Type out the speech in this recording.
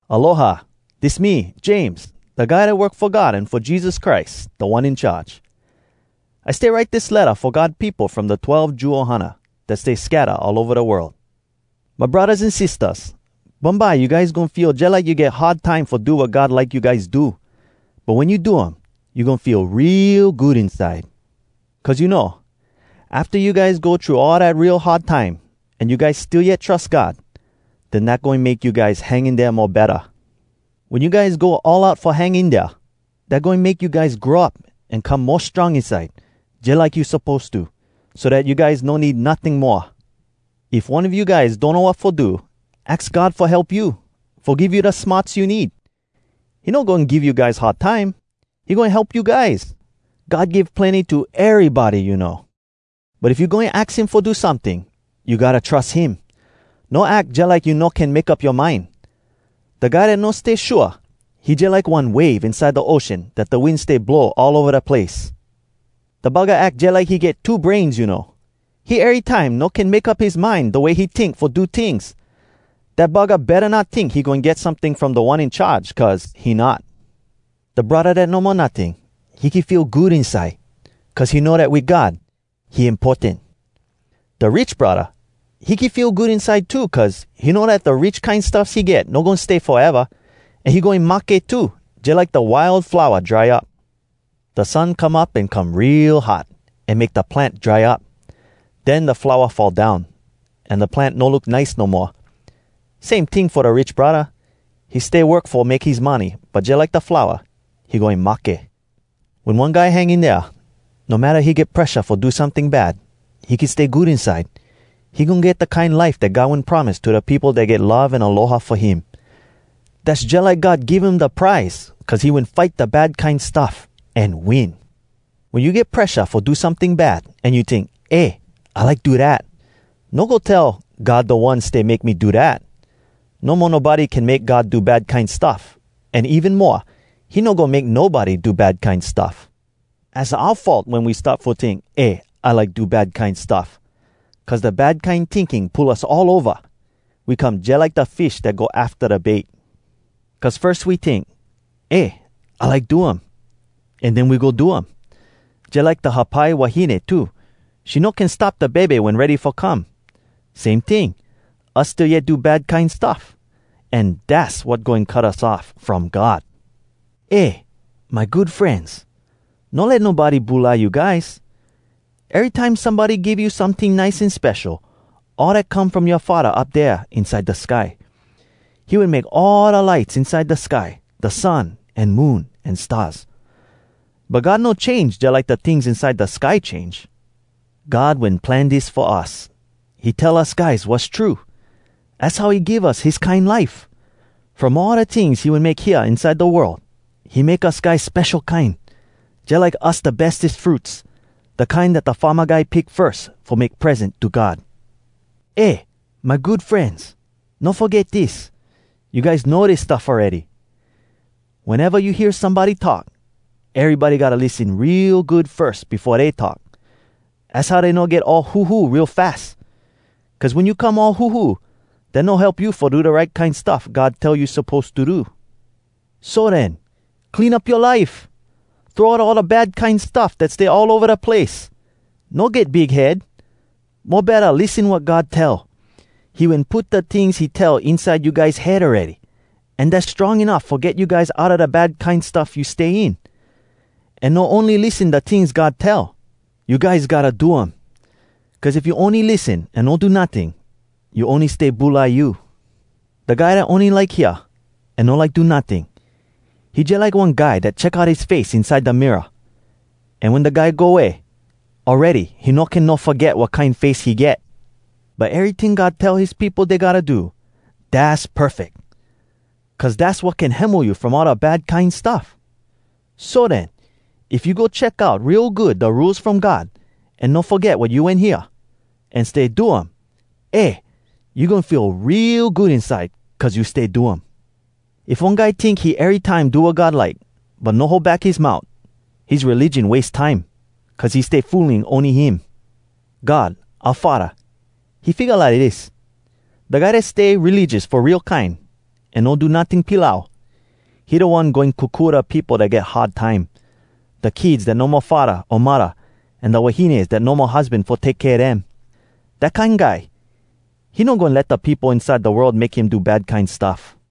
Aloha! Dis me, James, da guy dat work fo God an fo Jesus Christ, Da One In Charge. I stay write dis letta fo God peopo from da twelve Jew ohana, dat stay scatta all ova da world. My braddahs an sistahs! Bumbye you guys goin feel jalike you get hard time fo do wat God like you guys do. But wen you do um, you goin feel real good inside! Cuz you know, afta you guys go thru all dat real hard time, an you guys still yet trus God, den dat goin make you guys hang in dea mo betta. Wen you guys go all out fo hang in dea, dat goin make you guys grow up an come mo strong inside, jalike you suppose to, so dat you guys no need notting moa. If one a you guys donno wat fo do, aks God fo help you, fo give you da smarts you need! He no goin give you guys hard time. He goin help you guys. God give plenny to erybody, you know. But if you goin aks him fo do someting, you gotta trus him. No ack jalike you no can make up yoa mind. Da guy dat no stay shua, he jalike one wave inside da ocean dat da wind stay blow all ova da place. Da buggah ack jalike he get two brains, you know. He erytime no can make up his mind da way he tink fo do tings. Dat buggah betta not tink he goin get someting from Da One In Charge, cuz he not. Da braddah dat no mo notting, he can feel good inside, cuz he know dat wit God, he importan. Da rich braddah, he can feel good inside too, cuz he know dat da rich kine stuffs he get no goin stay foeva, an he goin mahke too, jalike da wild flowa dry up. Da sun come up an come real hot, an make da plant dry up. Den da flowa fall down, an da plant no look nice no moa. Same ting fo da rich braddah—he stay work fo make his money, but jalike da flowa, he goin mahke. Wen one guy hang in dea, no matta he get presha fo do someting bad, he can stay good inside. He goin get da kine life dat God wen promise to da peopo dat get love an aloha fo him. Dass jalike God give him da prize, cuz he wen fight da bad kine stuff, an win! Wen you get presha fo do someting bad, an you tink, “Eh, I like do dat!” no go tell, “God da One stay make me do dat.” No mo nobody can make God do bad kine stuff, an even moa, he no goin make nobody do bad kine stuff. Az oua fault wen we start fo tink, “Eh, I like do bad kine stuff!” Cuz da bad kine tinking pull us all ova. We come jalike da fish dat go afta da bait. Cuz firs we tink, “Eh, I like do um,” an den we go do um. Jalike da hapai wahine too, she no can stop da bebe wen ready fo come. Same ting, us still yet do da bad kine stuff. An dass wat goin cut us off from God. Eh, my good frenz! No let nobody bulai you guys. Erytime somebody give you someting nice an spesho, all dat come from yoa Faddah up dea inside da sky. He wen make all da lights inside da sky—da sun, an moon, an stars. But God no change jalike da tings inside da sky change. God wen plan dis fo us: He tell us guys wass true. Az how he give us his kine life. From all da tings he wen make hea inside da world, he make us guys spesho kine, jalike us da bestes fruits, da kine dat da farma guy pick firs fo make present to God. Eh, my good frenz! No foget dis: You guys know dis stuff awready. Weneva you hear somebody talk, erybody gotta lissen real good firs befo dey talk. Az how dey no get all huhu real fas. Cuz wen you come all huhu, dat no help you fo do da right kine stuff God tell you suppose to do. So den, clean up yoa life! Throw out all da bad kine stuff dat stay all ova da place! No get big head. Mo betta lissen wat God tell. He wen put da tings he tell inside you guys head awready, an dass strong enuff fo get you guys outa da bad kine stuff you stay in. An no ony lissen da tings God tell. You guys gotta do um! Cuz if you ony lissen an no do notting, you ony stay bulai you. Da guy dat ony like hear, an no like do notting, he jalike one guy dat check out his face inside da mirror. An wen da guy go way, awready he no can no foget wat kine face he get. But eryting God tell his peopo dey gotta do, dass perfeck, cuz dass wat can hemo you from all da bad kine stuff. So den, if you go check out real good da Rules from God, an no foget wat you wen hear, an stay do um, eh! you goin feel real good inside cuz you stay do um. If one guy tink he erytime do wat God like, but no hold back his mout, his religion wase time, cuz he stay fooling ony him! God oua Faddah, he figga lidis: Da guy dat stay religious fo real kine, an no do notting pilau, he da one goin kokua da peopo dat get hard time—da kids dat no mo faddah o muddah, an da wahines dat no mo husban fo take kea dem. Dat kine guy, he no goin let da peopo inside da world make him do bad kine stuff.